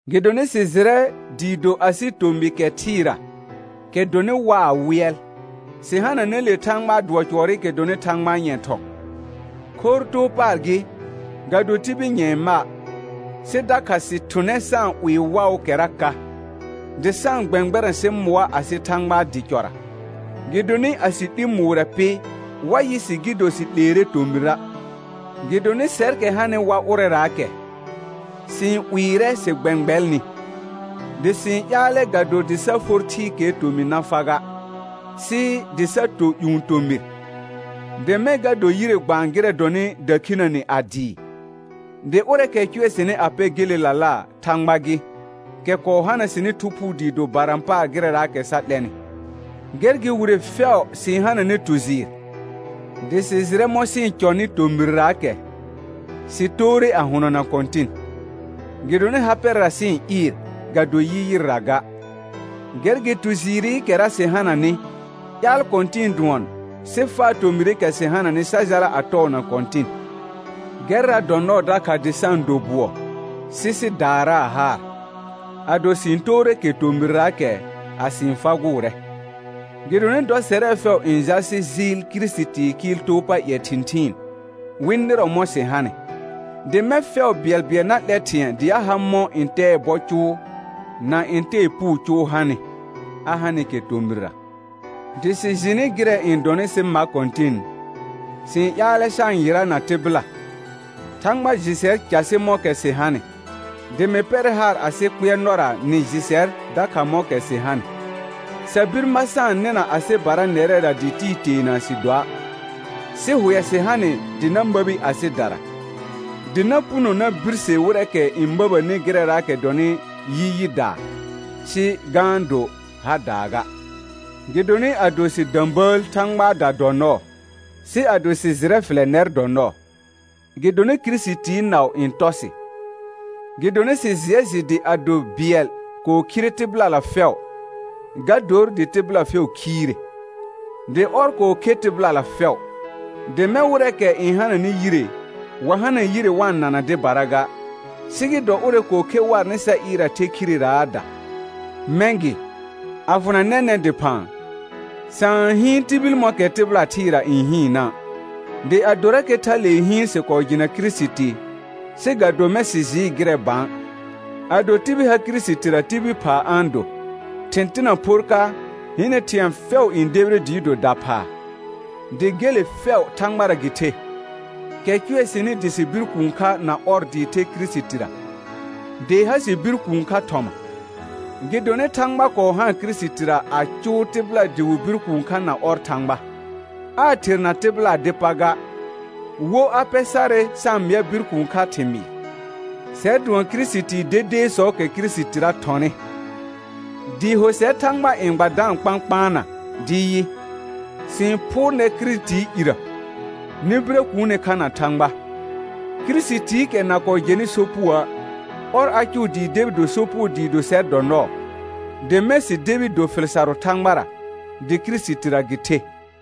Gɩdonɩ sɩ jɩrɛ dɩɩ do ado asɩ tomɩ kɛ thɩɩra, kɛ dɔnɩ waa wɩɛl, sɩ hananɛ le Thãgbaa dʋɔ cʋɔrɩkɛ dɔnɩ Thãgbaa nyɛ̃ thɔ̃, khorr too paar gɩ, ga do tibil nyɛ̃ɛ ma'. Sɩ dakha sɩ-n thʋnɛ sa-n 'wɩɩ waʋʋkɛra ka, dɩ sa-n gbɛ̃gbɛrɛ̃ sɩ mʋa asɩ Thãgbaa dɩ cɔra, gɩdonɩ a sɩ 'li mʋʋrɛ pɩ, wa yɩ sɩ gɩ do sɩ 'leere tomɩra'. Gɩdonɩ sɛrkɛ hanɩ wa ʋrɛraakɛ, sɩ-n 'wɩɩrɛ sɩ gbɛ̃gbɛlnɩ, dɩ sɩ-n ƴaalɛ ga do dɩ sa for thɩɩkɛɛ tomɩ na fa ga, sɩ dɩ sa to ƴũ tomɩr, dɩ mɛ̃ ga dor yire gbaan gɩrɛ dɔnɩ dakhinəne a dɩɩ. Dɩ ʋrɛɛkɛ cʋɛ sɩnɩ a pɛ gelelala, Thãgba gɩ, kɛ kɔɔ hana sɩnɩ Thu Phuu dɩ do barã paar gɩrɛraakɛ sa 'lɛnɩ. Gɛr gɩ wire fɛʋ sɩ-n hananɛ tu jɩɩr, dɩ sɩ jɩrɛ mɔ̃ sɩ-n cɔnɩ tomɩrraakɛ, sɩ toore a hʋnɔna Kɔ̃tɩn. Gɩdonɩ ha pɛrɛra sɩ-n ɩɩr, ga do yi yɩrra ga. Gɛr gɩ tu jɩɩrɩkɛra sɩ hananɩ, ƴaal kɔ̃tɩ̃ɩ dʋɔn, sɩ faa tomɩrɩkɛ sɩ hananɩ sa jala a tɔɔna Kɔ̃tɩn. Gɛrra dɔ nɔɔ dakha dɩ sa-n do bʋɔ, sɩ sɩ daaraa haar, ado sɩ-n toore kɛ tomɩrraakɛ, a sɩ-n fagʋʋrɛ. Gɩdonɩ dɔ sɛrɛ fɛʋ n jal sɩ jɩɩl Kirisitii kɩɩl too pa ƴɛ thɩ̃thɩɩn, wɩ nɩrɔ mɔ̃ sɩ hanɩ, dɩ mɛ̃ fɛʋ bɩɛlbɩɛl na 'lɛ thɩ̃ɛ dɩ a ha mɔ̃ ntɛɛ bɔ cʋʋ, na ntɛɛ puu cʋʋ hanɩ, a hanɩkɛ tomɩrra. Dɩ sɩ jɩnɩ gɩrɛ n dɔnɩ sɩ ma Kɔ̃tɩn, sɩ-n ƴaalɛ sa-n yɩrana tɩbɩla, Thãgba jɩ sɛr casɩ mɔ̃kɛ sɩ hanɩ, dɩ mɩ pɛrɛ haar anɩ kpɩɛrnɔra nɩ jɩ sɛr dakha mɔ̃kɛ sɩ hanɩ. Sa bir ma sa-n nɩna asɩbara nɛrɛra dɩ tɩɩ teena sɩ doa', sɩ hʋɛ sɩ ha nɩ dɩ na məbi asɩdara, dɩ na puno na birse wɩrɛɛkɛ n məbəni gɩrɛraakɛ dɔnɩ yi yɩdaa, sɩ ga-n do hadaa ga. Gɩdonɩ ado sɩ də̃bəəl Thãgbaada dɔ nɔɔ, sɩ ado sɩ jɩrɛ fɩlɛ nɛr dɔ nɔɔ. Gɩdonɩ Kirisitii naʋ n tɔ sɩ, gɩdonɩ sɩ jɩɛ jɩ dɩ ado bɩɛl kɔɔ khire tɩbɩlala fɛʋ, ga dor dɩ tɩbɩla fɛʋ khiire. Dɩ ɔr kɔɔ khe tɩbɩlala fɛʋ, dɩ mɛ̃ wɩrɛɛkɛ n hananɩ yire, wa hana yire wa-n nana dɩbara ga, sɩ gɩ dɔ ʋrɛ kɔɔ khe warnɩ sa ɩɩr a the khireraada. Mɛ̃ gɩ, a fʋna nɛnɛ̃ dɩphã, sa-n hɩɩn tibil mɔ̃kɛ tɩbɩla thɩɩra n hɩɩnna'. Dɩ adorakɛ thalee hɩɩn sɩ kɔɔ jɩna Kirisiti, sɩ ga do mɛ̃ sɩ jɩɩ gɩrɛ bã. Ado tibil ha Kirisitira tibil phaa a-n do, thɩ̃ tɩna phor ka, hɩnɛ thɩ̃ɛ fɛʋ n debire dɩɩ do daphaa. Dɩ gele fɛʋ Thãgbara gɩ the, kɛ cʋɛ sɩnɩ dɩ sɩ bir kũu kha na ɔr dɩɩ the Kirisitira, dɩ ha sɩ bir kũu kha thɔma. Gɩdonɩ Thãgba kɔɔ haan Kirisitira a cʋʋ tɩbɩla dɩ wɩ bir kũu kha na ɔr Thãgba, aa therna tɩbɩlaa dɩ pa ga, wo a pɛ sarɛ sa-n mɩa bir kũu kha thɩmɩɩr. Sɛr dʋɔn Kirisitii dedeesɔɔkɛ Kirisitira thɔnɩ, dɩɩ ho sɛr Thãgba n gba da-n kpãkpaana dɩ yɩ: Sɩ-n phʋʋr nɛr Kirisitii irə, nɩ birə kuune kha na Thãgba. Kirisitiikɛ na kɔɔ jɛnɩ sopugoə', ɔr a cʋʋ dɩ debi do sopugo dɩɩ do sɛr dɔ nɔɔ, dɩ mɛ̃ sɩ debi do fɩl sarʋ Thãgbara, dɩ Kirisitira gɩ the.